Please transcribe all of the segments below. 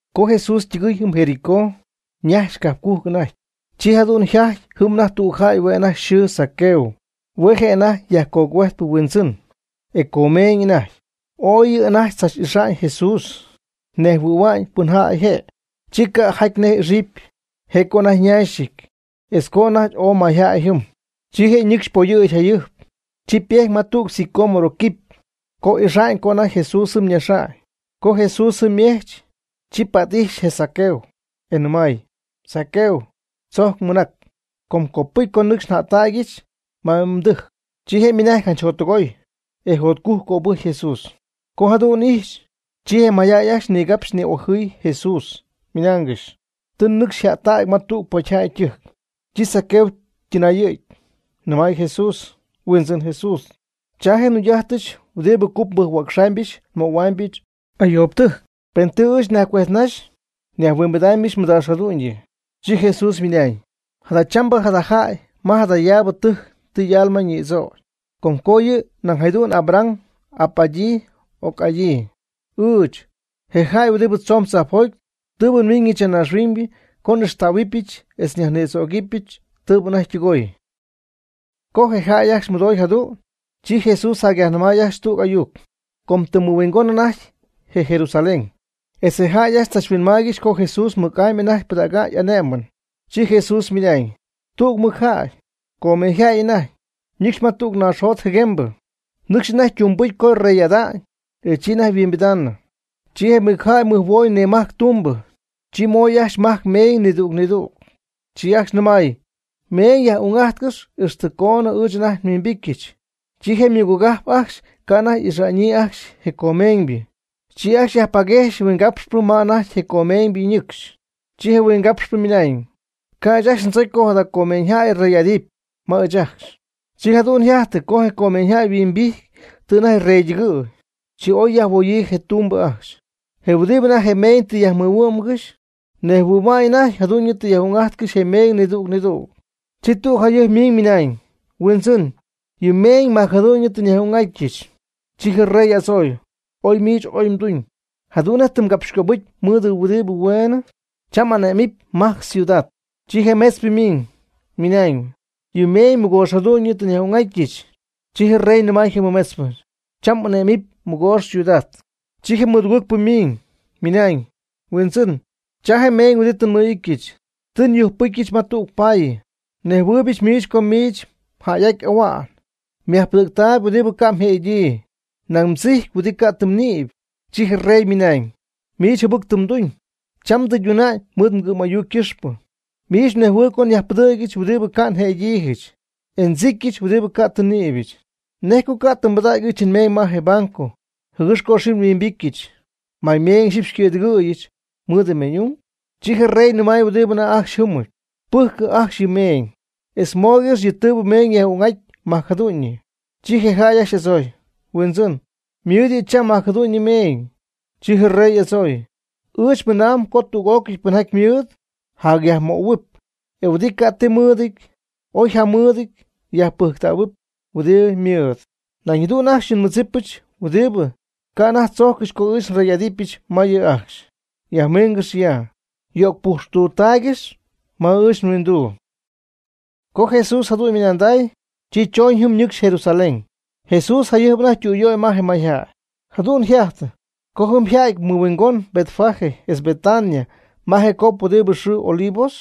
Co Jesús ytɨgɨɨy jɨm Jericó, ñajxy cajpcujc anajty. Chi jadu'n yjajty jɨm anajty tüg jäy hue' anajty yxɨɨ Zaqueo. Hue' je' anajty yajcogüejtpɨ huindzɨn, e comeeñ anajty. Ooy yɨ' anajty tzach'ixa'ñ Jesús, nejhuɨ̈hua'ñ pɨn jäy je', chi ca' jajty nej ixɨpy, je' co anajty ñaxɨty, etz co anajty ooy mayjäy jɨm. Chi je' ñɨcxy poyɨ̈gy jayɨjp, chi ypejty ma tüg sicómoro quipy, yco'ijxnaxa'ñ co anajty Jesús jɨm ñaxy. Co Jesús jɨm ymejch, chi pät'ijxy je Zaqueo, e nɨmay: ―Zaqueo, tzojc mɨnac, com copɨcy co nɨcxy njättäga'ñɨch ma mdɨjc. Chi je' ymɨnajty janch jottɨgoy, e jotcujc cöbɨjcy Jesús. Co jadu'n ijxy, chi je mayjäy ajcxy nigapxy ni'ojɨɨygɨxy Jesús, ymɨnaangɨxy: ―Tɨ ñɨcxy jättacpɨ ma tüg pocyjäy ytɨjc. Chi Zaqueo ytɨnayɨ̈gy, nɨmay Jesús: ―Huindzɨn Jesús, cha je' je njugy'ajtɨch huɨdi cup nbɨjc-huäcxaamyɨch nmöhua'ñɨch ayoobɨtɨjc. Pen tɨ ɨɨch nyajcuejtnaxy, nyajhuimbidɨpyɨch mɨdaax jadu'ñyɨ. Chi Jesús ymɨnañ: ―Jadachambɨ jada jäy ma jadayaabɨ tɨjc tɨ y'alma ñïdzögy, com co yɨ' nañ jadu'n Abraham y'ap'adyii y'oc'adyii. Ɨɨch, je jäy huɨdi tzoon tzajpjoty, tɨ nmiiñɨch ya naaxhuiñ co n'ixtähuɨbɨch etz nyajnïdzögɨbɨch tɨɨbɨ anajty ytɨgooy. Co je jäy ajcxy mɨdooy jadu'n, chi Jesús jacyajnɨmay ajcxy tüg ayuc, com ytɨmymɨhuingónɨp anajty Jerusalén, etz je jäy ajcxy tzachhuinmaaygɨxy co Jesús mɨc'amy anajty pɨdäga'ñ y'ané'mɨn. Chi Jesús ymɨnañ: ―Tüg mɨcjäy, comeeñyjäy anajty, ñɨcxy ma tüg naaxjot jɨguembɨ, nɨcxy anajty ytungbɨcy co yrey'ada'ñ, e chi anajty yhuimbidaanɨ. Chi je mɨcjäy mɨjhuooy nimajc ytumbɨ, chi moy ajcxy majc meeñ nidüg nidüg, chi ajcxy nɨmay: “Meeñ yaj'ung'ájtcɨx ji ixtɨ coonɨ ɨɨch anajty nhuimbityɨch.” Chi je ymɨgogajp ajcxy ca' anajty ixa'ñyii ajcxy je comeeñybɨ, chi ajcxy yajpaguejxy huingapxpɨ ma anajty je comeeñybɨ ñɨcxy, chi je huingapxpɨ ymɨnañ: “Ca' ɨɨch ajcxy ndzocy co jada comeeñyjäy rey'adɨpy ma ɨɨch ajcxy.” Chi jadu'n yjajty co je comeeñyjäy yhuimbijty tɨ anajty yreytɨgɨ̈y. Chi oy yajhuoyii je ytumbɨ ajcxy, je huɨdi anajty je meeñ tɨ yajmɨhuɨ'mgɨxy, nejhuɨ̈hua'ñ anajty jadu'ñɨ tɨ yaj'ung'ajtcɨxy je meeñ nidüg nidüg. Chi tüg jayɨjp ymiñ ymɨnañ: “Huindzɨn, yɨ meeñ majcjadu'ñɨ tɨ nyaj'ung'atyɨch.” Chi je rey y'adzooy: “Ooy miich oy mduñ. Jadu'n nej tɨ mgapxycöbɨcy mɨɨd huɨdi hueenɨ, cham m'ané'mɨpy majc ciudad.” Chi je mɨmetzpɨ ymiiñ, ymɨnañ: “Huindzɨn, yɨ mmeeñ mɨgoox jadu'ñyɨ tɨ nyaj'ung'atyɨch.” Chi je rey nɨmay je mɨmetzpɨ: “Cham m'ane'mɨpy mɨgoox ciudad.” Chi je mɨdugɨɨgpɨ ymiñ, ymɨnañ: “Huindzɨn, cha je mmeeñ huɨdi tɨ nmɨ'ityɨch, tɨ nyujcpɨcyɨch ma tüg paayɨ. Ndzɨgɨɨybɨch miich co miich mjäy'aty ahua'ñ, myajpɨdɨ̈gtäy huɨdi ca' mjë'adyii, nañ mdzijcpy huɨdi ca' tɨ mnïpy.” Chi je rey ymɨnañ: “Miich jɨbɨc tɨ mduñ, cham ndɨyduna'ñ mɨɨd mgɨ'm'ayuc ycɨxpɨ. Miich mnejhuɨyb co nyajpɨdɨ̈gyɨch huɨdi ca' një'adyiijɨch, e ndzicyɨch huɨdi ca' tɨ nnïbyɨch. ¿Nej co ca' tɨ mbɨdägy ɨɨch nmeeñ ma je banco, jɨgɨx co ixyipy nhuimbityɨch, may meeñ ixyipy xycɨ̈dɨgɨ̈yɨch mɨɨd meeñ'ung?” Chi je rey nɨmay huɨdi anajty ajcxy jɨ́mɨp: “Pɨjcɨ ajcxy yɨ' ymeeñ, etz mooygɨxy yɨ' tɨɨbɨ meeñ yaj'ung'aty majc jadu'ñyɨ.” Chi je jäy ajcxy y'adzooy: “Huindzɨn, ymɨɨd yɨ' cham majc jadu'ñyɨ meeñ.” Chi je rey y'adzooy: “Ɨɨch mɨnaam co tüg'ócɨy pɨnjaty mɨɨd, jacyajmöhuɨp; e huɨdi ca' ti mɨɨdɨty, oy jamɨɨdɨty yajpɨjctähuɨp huɨdi ymɨɨd. Nañ jadu'n ajcxy je nmɨdzipɨch huɨdi ca' anajty tzojccɨxy co ɨɨch nrey'adɨpyɨch ma yɨ' ajcxy, yajmiingɨx ya, yo'cpujxtutaaygɨx ma ɨɨch nhuinduu.” Co Jesús jadu'n ymɨnanday, chi choñ jɨm, ñɨcxy Jerusalén. Jesús jayɨjp anajty ytüyöy ma je mayjäy. Jadu'n yjajty co jɨm yja'ty mɨhuingon Betfagé etz Betania ma je cop huɨdi yxɨɨ Olivos,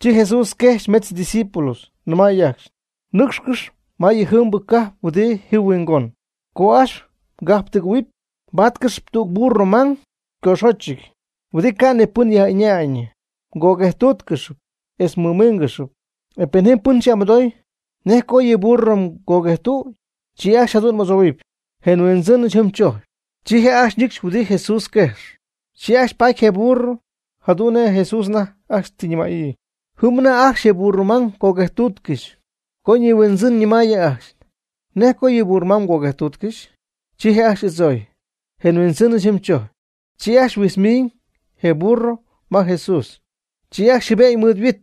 chi Jesús quejxy metz ydiscípulos, nɨmay ajcxy: ―Nɨ́cxcɨx ma yɨjiibɨ cajp huɨdi ji huingon. Co ajcxy mgajptugɨ̈huɨp mbáatcɨxɨpy tüg burro mang ycoxochɨty, huɨdi ca' ni pɨn yaj'ɨñaayñɨ. Mgoguejtúutcɨxɨpy, etz mmɨmíingɨxɨpy. Pen jɨm pɨn xy'amɨdoogɨxy, ¿nej co yɨ burro mgoguejtüdy? Chi ajcxy jadu'n m'adzohuɨpy: “Je nhuindzɨnɨch jɨm tzojcp.” Chi je' ajcxy ñɨcxy huɨdi Jesús yquejx. Chi ajcxy paty je burro jadu'n nej Jesús anajty ajcxy tɨ ñɨmäyii. Jɨm anajty ajcxy je burro mang coguejtuutcɨxy, co ñihuindzɨn ñɨmaayɨ ajcxy: ―¿Nej co yɨ burro mang mgoguejtuutcɨxy? Chi je' ajcxy y'adzooy: ―Je nhuindzɨnɨch jɨm tzojcp. Chi ajcxy huijtz miñ je burro ma Jesús. Chi ajcxy jɨbe'ñ mɨɨd yhuit,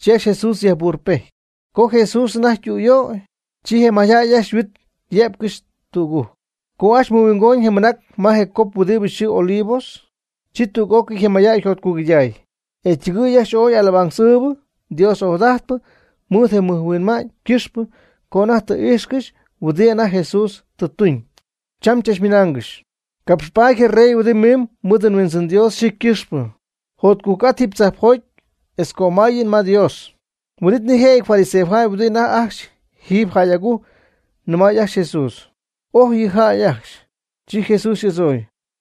chi ajcxy Jesús yajburrɨpejty. Co Jesús anajty ytüyöy, chi je mayjäy ajcxy yhuit yé'pcɨxy tügujc. Co ajcxy mɨhuingoñ je mɨnac ma je cop huɨdi yxɨɨ Olivos, chi tüg'ócɨy je mayjäy yjotcugɨyday, e ytɨgɨɨy ajcxy ooy alabanza ɨɨbɨ Dios ojadajtpɨ mɨɨd je mɨj huinma'ñ ycɨxpɨ co anajty tɨ íjxcɨxy huɨdi anajty Jesús tɨ tuñ. Chachmɨnaangɨxy: ―¡Capxpaady je rey huɨdi miimb mɨɨd Huindzɨn Dios yxɨɨ ycɨxpɨ! ¡Jotcujc'ajt jiiby tzajpjoty etz cömáyɨn ma Dios! Huin'it nijëjɨty fariseojäy huɨdi anajty ajcxy jiiby jäy agujc nɨmay ajcxy je Jesús: ―Oj yɨ mjäy ajcxy. Chi Jesús y'adzooy: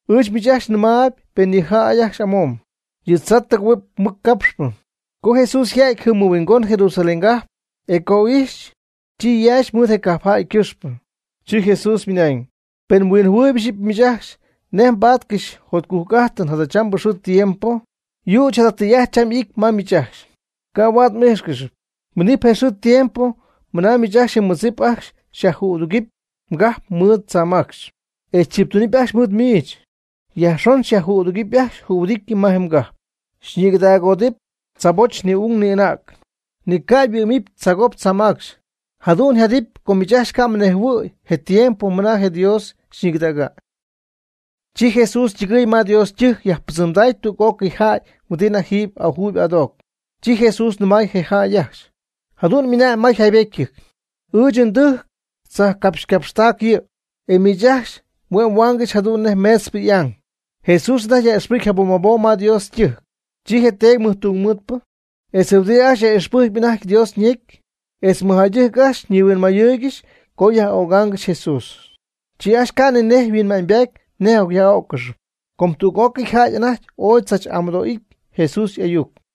―Ɨɨch miich ajcxy nɨmaayb pen yɨ' ajcxy amomb, yɨ tzaa tɨgɨ̈huɨp mɨc capxp. Co Jesús yja'ty jɨm mɨhuingon Jerusalén cajp, e co ijxy, chi yaaxy mɨɨd je cajpjäy ycɨxpɨ. Chi Jesús ymɨnañ: ―¡Pen mhuinjɨhuɨɨyb ixyipy miich ajcxy nej mbáatcɨxɨpy mjotcujc'ájtɨn jadachambɨ xɨɨ tiempo! Yüch jada tɨy'ajt cham ity ma miich ajcxy, ca' huaad m'íjxcɨxy. Minɨp je xɨɨ je tiempo ma miich ajcxy je mmɨdzip ajcxy xyajjüdugɨpy mgajp mɨɨd tzaamacxy, e tziptunɨpy ajcxy mɨɨd miich, yajxon xyajco'adugɨpy ajcxy jühuɨdity ma je mgajp. Xyñigɨdaagoodɨp mdzaaboch ni'ung ni'anäg, ni ca' yhuɨ́'mɨp tzaagop tzaamacxy, jadu'n yjadɨpy com miich ajcxy ca' mnejhuɨ̈y je tiempo mɨna je Dios xyñigɨdägy. Chi Jesús ytɨgɨɨy ma Dios ytɨjc yajpɨdzɨmday tüg'ócɨy jäy huɨdi anajty jiiby ajuuyb adoocp. Chi Jesús nɨmay je jäy ajcxy: ―Jadu'n mɨna'ñ ma jaybétyɨty: “Ɨɨch ndɨjcɨ tzajpcapxycapxtägɨ'ñ yɨ'.” E miich ajcxy hue' mhuaangɨxy jadu'n nej meetzpɨ y'ang. Jesús anajty yaj'ixpɨjc jabom jabom ma Dios ytɨjc, chi je teedy tungmɨɨdpɨ, etz huɨdi ajcxy yaj'ixpɨjcp anajty Dios ñecy, etz mɨjjäydɨjc ajcxy nihuinmayɨɨygɨxy co yaj'ögaangɨxy Jesús. Chi ajcxy ca' ni nej mɨhuinma'ñybaty nej yaj'öccɨxy, com tüg'ócɨy jäy anajty ooy tzach'amɨdoo'ijt Jesús y'ayuc.